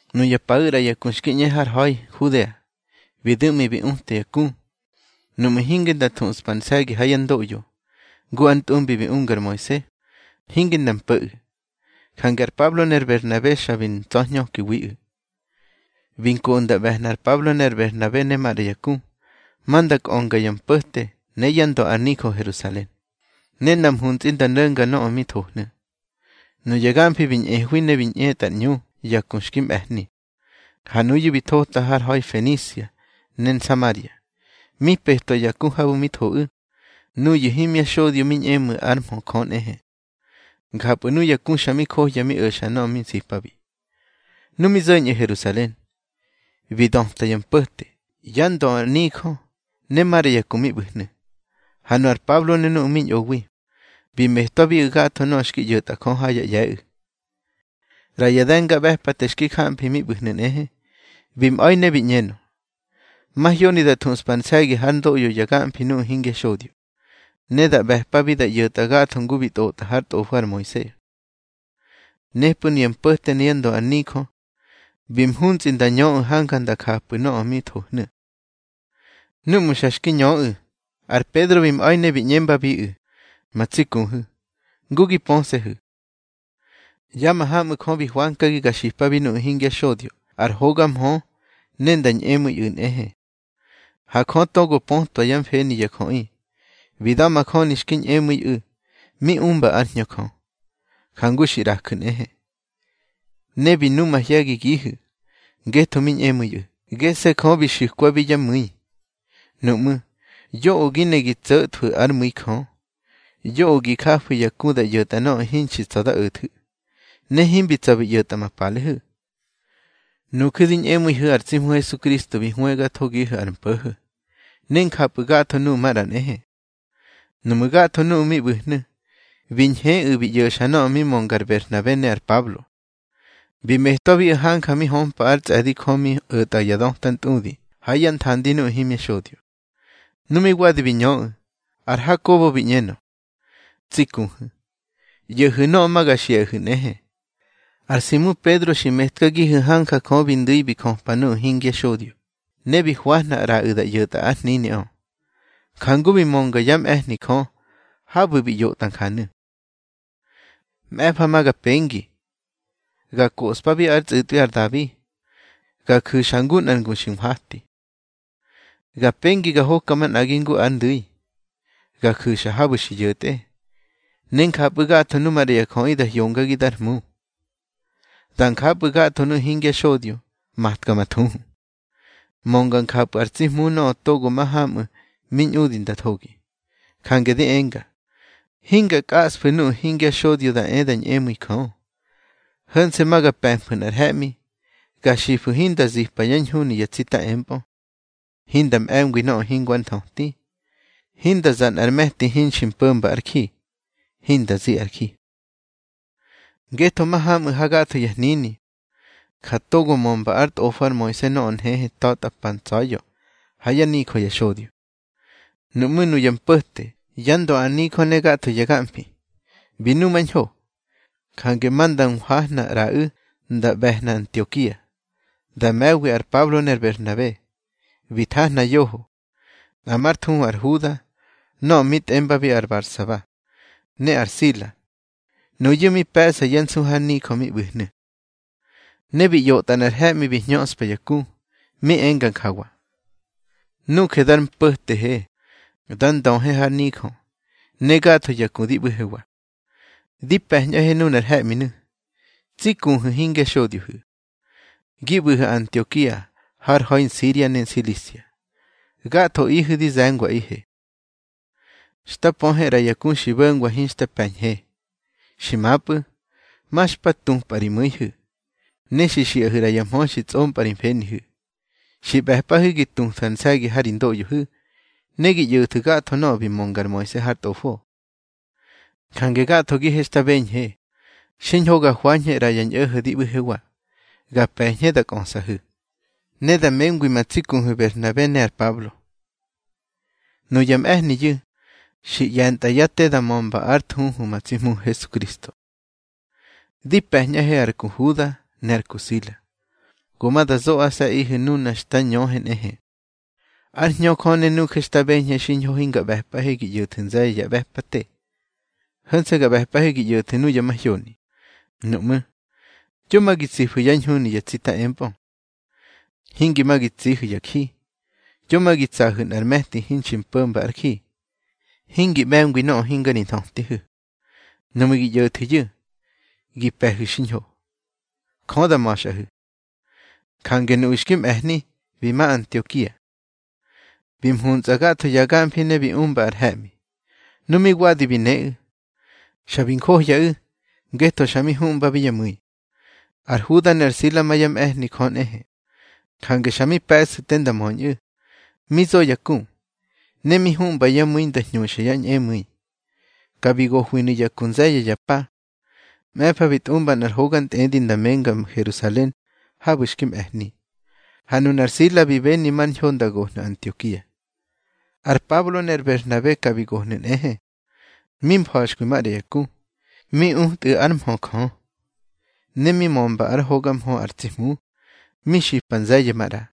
Nuya paꞌu̱ ꞌra ya ku xki ꞌñe har ha̱i Nhudea, bi du̱ꞌmi bi uta ya ku, nuꞌmu̱ hinge nda thuꞌspa ar nse̱gi ha yá ndoꞌyo, ngu ar ntꞌumbi bi unga ar Moise, hinge nda mpo̱ꞌu̱. Jange ar Pablo ne ar Berhnabe xa bi ntsa̱hñökiwiꞌu̱. Bi nkoꞌu̱ nda ꞌbe̱hna ar Pablo ne ar Berhnabe ne maꞌra ya ku, ma nda kꞌönga ya mpo̱te ne yá ndö ar nijö Herusalen, ne nda mhuntsꞌi nda no̱nga nöꞌö mi thohnu̱. Nuya gamfi bi ñꞌehwi ne bi ꞌñetꞌar ꞌñu ya ku xki mꞌe̱hni. Ha nuyu̱ bi thotꞌu̱ har ha̱i Fenisia ne Nsamaria, mi petwa ya ku habu̱ mi thoꞌu̱, nuyu̱ himya xodyo mi ñꞌemu̱i ár mhö Jö nꞌehe. Njapꞌu̱ nuya ku xa mi johya mi o̱xa nöꞌö mi nsipabi. Nu mi zo̱ñꞌu̱ Herusalen, bi döta ya mpo̱te, yá ndö ar nijö, ne maꞌra ya ku mi ꞌbu̱hnu̱. Ha nu ar Pablo ne nuꞌu̱ mi ñꞌowi, bi metwabiꞌu̱ gatho nöꞌö xki ꞌyo̱tꞌa Jö ha yá ꞌye̱ꞌu̱. ꞌRa ya de̱ngaꞌbe̱pate xki jamfi mi ꞌbu̱hnu̱ nꞌehe, bi mꞌa̱i ne bi ꞌñenö: —Mahyoni da thuꞌspa ar nse̱gi hár ndoꞌyo ya gamfi nuꞌu̱ hingya xodyo, ne da ꞌbe̱pabi da ꞌyo̱tꞌa gatho ngu bi tꞌotꞌa hár tꞌofo ar Moise. Nepꞌu̱ nuya mpo̱te ne yá ndö ar nijö bi mhuntsꞌi nda ñöꞌu̱ hanja nda japꞌu̱ nöꞌö mi thohnu̱. Núꞌmu̱ ya xa xki ñöꞌu̱, ar Pedro bi mꞌa̱i ne bi ꞌñembabiꞌu̱: —Ma tsi kuhu̱, ngu gi pöse̱hu̱, ya mahamꞌu̱ Jö bi hwankagi ga xipabi nuꞌu̱ hingya xodyo ar hoga mhö ne nda ñꞌemu̱iꞌu̱ nꞌehe. Ha Jö togo pötwa yá mfeni ya jöꞌi, bi da̱majöni xki ñꞌemu̱iꞌu̱ mi umba ár Hñö Jö, jangu xi ꞌrakagihu̱ nꞌehe. Ne bi nu mahye̱gigihu̱, ngetho mi ñꞌemu̱iꞌu̱, gese̱ Jö bi xu̱kwabi yá mu̱i. Nuꞌmú̱, yoꞌö gi ne gi tso̱thwu̱ ár mu̱i Jö. Yoꞌö gi jafu̱ ya ku da ꞌyo̱tꞌa nöꞌö hinxi tsa̱ dá o̱thu̱, ne himbi tsa̱ bi ꞌyo̱tꞌa ma palehu̱. Nuju̱ di ñꞌemu̱ihu̱ ar tsi Hmu Hesukristo bi hwëgathohu̱ ar mpo̱ho̱, ne njapꞌu̱ gatho nuꞌu̱ maꞌra nꞌehe. Nuꞌmú̱ gatho nuꞌu̱ mi ꞌbu̱hnu̱, bi ñheꞌu̱ bi ꞌyo̱xa nöꞌö mi mönga ar Berhnabe ne ar Pablo. Bi metwabiꞌu̱ hanja mi hömpa ár tsꞌe̱di Jö mi o̱tꞌa ya döta ntꞌudi ha yá nthandi nuꞌu̱ himya xodyo Nu mi wadi bi ñöꞌu̱, ar Hakobo bi ꞌñenö: —Tsi kuhu̱, ꞌyo̱hu̱ nöꞌö ma ga xiꞌahu̱ nꞌehe. Ar Simu Pedro xi metkagihu̱ hanja Jö bi ndu̱i bi jöpa nuꞌu̱ hingya xodyo, ne bi hwahna ꞌraꞌu̱ da ꞌyo̱tꞌa ár hniniꞌö. Njangu bi mönga yá mꞌe̱hni Jö habu̱ bi ꞌyotꞌa njanu̱: Mꞌe̱fa ma ga pengi, ga koꞌspabi ár tsꞌu̱tꞌwi ar Dabi, ga ju̱xa ngu nꞌar ngu xki nhwati. Ga pengi ga hoka manꞌagi ngu ar ndu̱i, ga ju̱xa habu̱ xi yo̱tꞌe. Ne njapꞌu̱ gatho nuꞌu̱ maꞌra ya jöꞌi da hyongagi dar Hmu, da njapꞌu̱ gatho nuꞌu̱ hingya xodyo matka ma thuhu. Mönga njapꞌu̱ ar tsi Hmu nöꞌö togo mahamꞌu̱ mi ñꞌudi nda thogi. Jange di enga, hinga kꞌasfu̱ nuꞌu̱ hingya xodyo da e da ñꞌemu̱i Jö. Ho̱nse̱ ma ga pe̱mfu̱ nꞌar he̱ꞌmi, ga xifu̱ hinda zipa yá ñhuni ya tsita empꞌö, hinda mꞌe̱ngwi nöꞌö hingo ár nthöti, hinda za nꞌar me̱ti hinxi mpo̱mba ár ji, hinda zi ar ji. Ngetho mahamꞌu̱ hagatho ya hnini, ja togo mömba ár tꞌofo ar Moise nöꞌö nhehe tatꞌa pa ntsa̱ya̱ ha yá nijö ya xodyo. Nuꞌmú̱ nuya mpo̱te, yá ndö ar nijö ne gatho ya gamfi, bi numañho. Jange ma nda nhwahna ꞌraꞌu̱ nda ꞌbe̱hna Antiokia, da me̱wi ar Pablo ne ar Berhnabe. Bi thahna yoho, nꞌa már thuhu ar Huda nöꞌö mi tꞌembabi ar Barsaba, ne ar Sila. Nuyu̱ mi pe̱ꞌsa yá nsu har nijö mi ꞌbu̱hnu̱. Ne bi ꞌyotꞌa nꞌar he̱ꞌmi bi hñöꞌspa ya ku, mi enga njawa: Nuje dar mpo̱tehe, dar ndöhe har nijö, ne gatho ya ku di ꞌbu̱hewa, dí pe̱ñꞌahe nuna he̱ꞌminu̱, tsi kuhu̱ hingya xodyohu̱, gi ꞌbu̱hu̱ Antiokia har ha̱i Nsiria ne Nsilisia. Gathoꞌihu̱ di ze̱ngwaꞌihe. Xta pöhe ꞌra ya ku xi bo̱ngwa hinxta pe̱ñhe. Xi mapꞌu̱, ma xpa tupꞌa ri mu̱ihu̱, ne xi xiꞌahu̱ ꞌra ya mhö xi tsꞌompꞌa ri mfenihu̱. Xi ꞌbe̱pꞌahu̱ gi tuthu̱ ar nse̱gi ha ri ndoꞌyohu̱, ne gi ꞌyo̱thu̱ gatho nöꞌö bi mönga ar Moise har tꞌofo. Jange gathogihe xta beñhe xiñho ga hwañhe ꞌra ya ñꞌo̱ho̱ di ꞌbu̱hewa, ga pe̱ñhe da kꞌösꞌahu̱, ne da mengwi ma tsi kuhu̱ Berhnabe ne ar Pablo. Nuya mꞌe̱hniyu̱ xi ꞌye̱ntꞌa yá te da mömba ár thuhu ma tsi Hmuhu̱ Hesukristo. Di pe̱ñꞌahe ar ku Huda ne ar ku Sila, go ma da zoꞌase̱ꞌihu̱ nuna xta ñöhe nꞌehe. Ár Hñö Jö ne nuje xta beñhe xiñho hinga ꞌbe̱pꞌahe gi ꞌyo̱thu̱ nze̱ye̱ ya ꞌbe̱pate. Ho̱nse̱ ga ꞌbe̱pꞌahe gi ꞌyo̱thu̱ nuyu̱ mahyoni: Nuꞌmú̱, yo ma gi tsifu̱ yá ñhuni ya tsita empꞌö, hingi ma gi tsihu̱ ya ji, yo ma gi tsahu̱ nꞌar me̱ti hinxi mpo̱mba ár ji, hingi ꞌbe̱ngwi nöꞌö hinga ri nthötihu̱. Nuꞌmu̱ gi ꞌyo̱thu̱yu̱, gi pe̱hu̱ xiñho. Jö da ma̱xꞌahu̱. Jange nuꞌu̱ xki mꞌe̱hni, bi ma Antiokia. Bi mhuntsꞌa gatho ya gamfi ne bi umba ar he̱ꞌmi. Nu mi wadi bi neꞌu̱, xa bi njohyaꞌu̱ ngetho xa mi huꞌmbabi yá mu̱i. Ar Huda ne ar Sila ma yá mꞌe̱hni Jö nꞌehe, jange xa mi pe̱sꞌu̱ te nda möñꞌu̱, mi zo ya ku, ne mi huꞌmba yá mu̱i nda hñuxa yá ñꞌemu̱i. Ka bi gohwinu̱ ya ku nze̱ye̱ ya pa. Mꞌe̱fa bi tꞌumba nꞌar hoga ntꞌedi nda menga Herusalen habu̱ xki mꞌe̱hni. Ha nunar Sila bi beni mar ñho nda gohnu̱ Antiokia. Ar Pablo ne ar Berhnabe ka bi gohnu̱ nꞌehe, mi mfa̱xkwi maꞌra ya ku, mi utꞌu̱ ár mhö Jö, ne mi mömba ár hoga mhö ar tsi Hmu, mi xipa nze̱ye̱ maꞌra.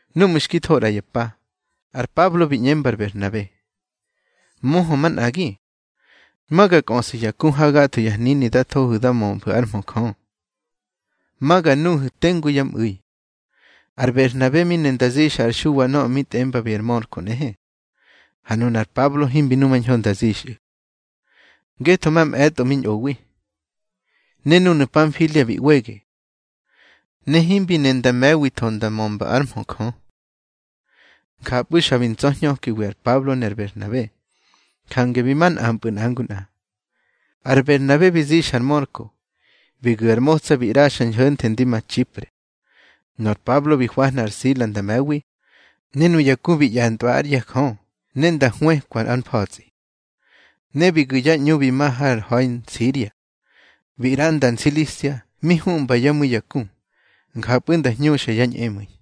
Núꞌmu̱ xki tho ꞌra ya pa, ar Pablo bi ꞌñemba ar Berhnabe: —Möhö manꞌagi, ma ga kꞌöꞌsu̱ ya ku ha gatho ya hnini da thohu̱ da mömfu̱ ár mhö Jö, ma ga nuhu̱ tengu yá mꞌu̱i. Ar Berhnabe mi ne nda zixa ar Xuwa nöꞌö mi tꞌembabi ar Mörko nꞌehe. Ha nunar Pablo himbi numañho nda zixꞌu̱, ngetho mamꞌe̱tꞌo mi ꞌñowi, ne núnu̱ Panfilia bi ꞌwege, ne himbi ne nda me̱witho nda mömba ár mhö Jö. Njapꞌu̱ xa bi ntsa̱hñökiwi ar Pablo ne ar Berhnabe, jange bi ma nꞌampꞌu̱ nꞌa ngu nꞌa. Ar Berhnabe bi zixa ar Mörko, bi gu̱ ar motsa bi ꞌraxa ñho̱nthe ndi ma Txipre. Nor Pablo bi hwahna ar Sila nda me̱wi. Ne nuya ku bi ꞌye̱ntꞌwa ár ꞌye̱ Jö ne nda hwëkwa ár mfa̱tsꞌi. Ne bi gu̱ yá ꞌñu bi ma har ha̱i Nsiria, bi ꞌranda Nsilisia mi huꞌmba yá mu̱i ya ku, njapꞌu̱ nda hñuxa yá ñꞌemu̱i.